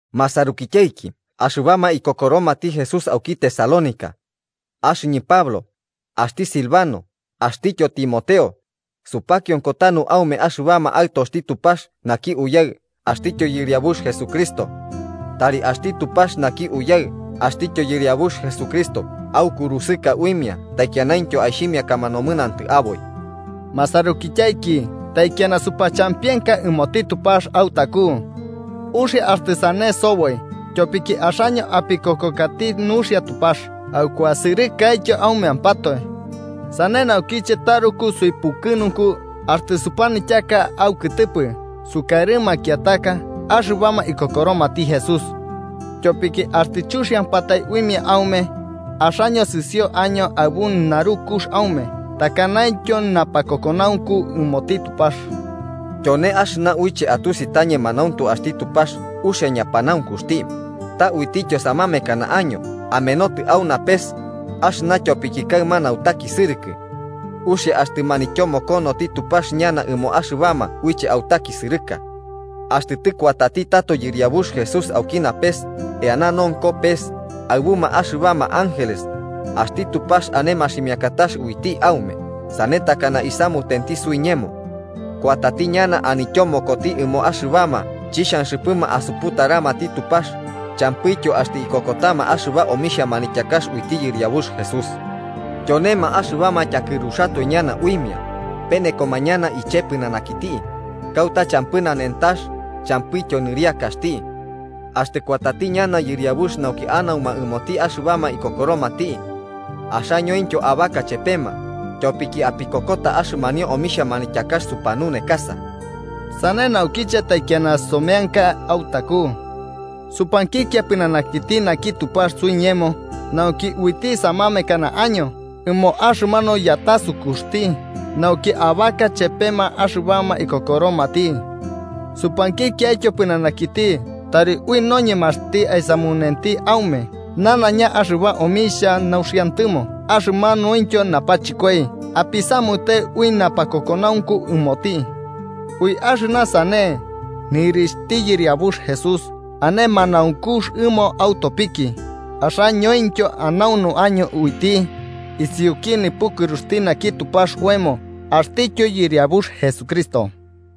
Masarukityaiki axɨbama ikokoromati Jesús auki Tesalónica: Axɨñɨ Pablo, axti Silvano axtityo Timoteo, supakionko tanu aume axɨbama aɨtoxti Tupax naki Uyaɨ axtityo Yɨriabux Jesucristo. Tari axti Tupax naki Uyaɨ axtityo Yɨriabux Jesucristo aukurusɨka uimia taikianaintyo aixhimiakama nomɨnantɨ aboi. Masarukityaiki, taikiana supachampienka ɨmoti Tupax autaku. Uxia axtɨ sane soboi, tyopiki axaño apikokokati nuxia Tupax aukuasɨrɨkaityo aumeampatoe. Sane naukiche taruku suipukɨnunku axtɨ supanityaka aukɨtɨpɨ sukarɨ makiataka axɨbama ikokoromati Jesús. Tyopiki axtɨ chuxiampatai uimia aume, axaño sɨsio año aɨbu narukux aume takanaintyo napakokonaunku ɨmoti Tupax. Tyone axɨna uiche atusi ta ñemanauntu axti Tupax uxia ñapanaunkuxti, ta uitityo samamekana año amenotɨ au napes, axɨna tyopiki kaɨma nautakisɨrɨkɨ. Uxia axtɨ manityomokonoti Tupax ñana ɨmoma axɨbama uiche autakisɨrɨka. Axtɨ tɨkuatati tato Yɨriabux Jesús auki napes, eana nonko pes, aɨbuma axɨbama ángeles, axti Tupax ane maximiakatax uiti aume sane takana isamutenti suiñemo. Kuatati ñana anityomokoti ɨmoma axɨbama chixhanxɨpɨma asuputaramati Tupax champɨityo axtɨ ikokotama axɨba omixhia manityakax uiti Yɨriabux Jesús. Tyonema axɨbama tyakɨruxatoe ñana uimia, penekoma ñana iche pɨnanakiti, kauta champɨ nanentax champɨityo nɨriakaxti. Axtɨ kuatati ñana yɨriabux nauki anauma ɨmoti axɨbama ikokoromati. Axañointyo abaka chepema, tyopiki apikokota axɨmanio omixhia manityakax sopiñununekakaño. Sane naukiche taikiana someanka autaku. Supankikia pɨnanakiti naki Tupax suiñemo, nauki uiti samamekana año ɨmo axɨmanu yatasukuxti, nauki abaka chepema axɨbama ikokoromati. Supankikiaityo pɨnanakiti tari ui noñemaxti aisamunenti aume nanaiña axɨba omixhia nauxiantɨmo axɨmanuintyo napachɨkoi apisamute ui napakokonaunku ɨmoti. Ui axɨna sane, nɨrixhti Yɨriabux Jesús ane manaunkux ɨmo autopiki, axañointyo anaunu año uiti, isiuki nipukɨruxti naki Tupax oemo axtityo Yɨriabux Jesucristo.